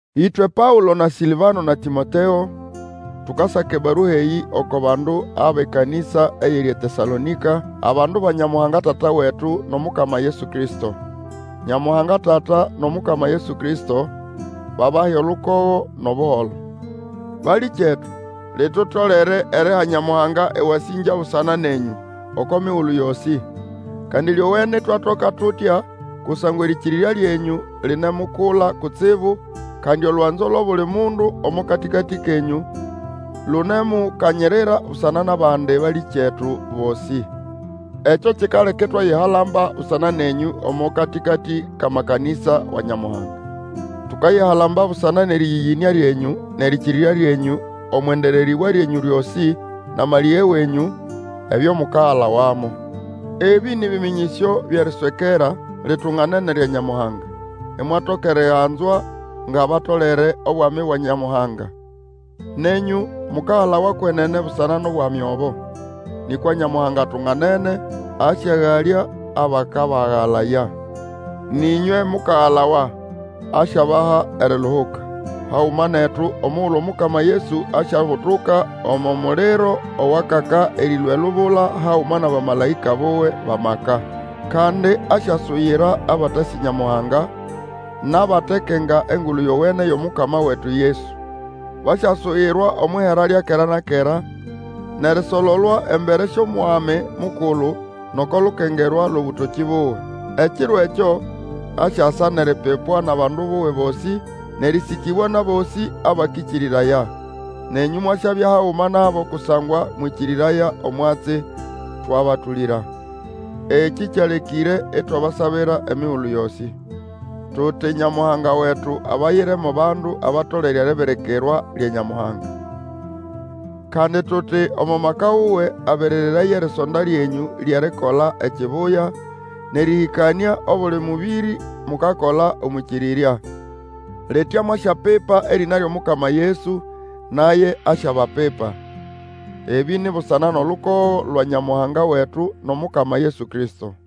Ĩtwe Paũlo na Sĩlvano na Tĩmoteo, tukasaka ebarua eyĩ oko bandu abʼekanĩsa eyiri eTesalonĩka, abandu ba Nyamuhanga Tata wetu, nʼOmukama Yesu Kristo. Nyamuhanga Tata, nʼOmukama Yesu Kristo babahe olukogo nʼobuholo. Balĩkyetu, litutolere eriha Nyamuhanga ewasĩngya busana nenyũ oko migulu yosĩ! Kandi lyowene itwakola tutya, kusangwa erĩkĩrĩrya lyenyũ linemukula kutsibu, kandi olwanzo lwʼobuli mundu omo katĩkatĩ kenyũ lunemukanyirira busana nʼabandi balĩkyetu bosĩ. Ekyo kikaleka itwayihalamba busana nenyũ omo katĩkatĩ kʼamakanĩsa wa Nyamuhanga. Tukayihalamba busana nʼerĩyĩyĩnĩa lyenyũ nʼerĩkĩrĩrya lyenyũ omwʼendererĩbwa lyenyũ lyosĩ, nʼamalĩge wenyũ, ebyo mukagalawamo. Ebĩ nĩ bĩmĩnyĩsyo byʼeritswera litunganene lya Nyamuhanga, imwatoka eriganzwa ngʼabatolere obwami bwa Nyamuhanga. Nenyũ mukagalawa kwenene busana nʼobwami obo. Nĩkwa Nyamuhanga atunganene; asyagalya abakabagana. Nʼĩnywe mukagalawa asyabaha eriluhuka, haguma netu, omugulu Omukama Yesu asyabutuka omo muliro owakaka erĩlũa elubula haguma nʼabamalaĩka buwe bʼamaka. Kandi asyasuyira abatasĩ Nyamuhanga, nʼabatekenga Engulu Yowene yʼomukama wetu Yesu. Basyasuyirwa omwʼihera lya kera na kera, nʼerisololwa embere syʼOmwami Mukulu, nʼoko lukengerwa lwʼobũtokĩ buwe, ekiro ekyo asyasa nʼeripipwa nʼabandu buwe bosĩ, nʼerĩsĩkĩbwa nʼabosĩ abakĩkĩrĩraya. Nenyũ mwasyabya haguma nabo kusangwa mwĩkĩrĩraya omwatsi twabatũlĩra. Ekĩ kyalekĩre itwabasabira emigulu yosĩ. Tuti Nyamuhanga wetu abayire mo bandu abatolere eribirikirwa lya Nyamuhanga. Kandi tuti omo maka wuwe aberereraye erisonda lyenyũ lyʼerikola ekibuya, nʼerĩhĩkanĩa obuli mũbĩrĩ mukakola omwʼĩkĩrĩrya. Litya mwasyapipa erĩna lyʼomukama Yesu, naye asyabapipa. Ebĩ ni busana nʼolukogo lwa Nyamuhanga wetu nʼOmukama Yesu Kristo.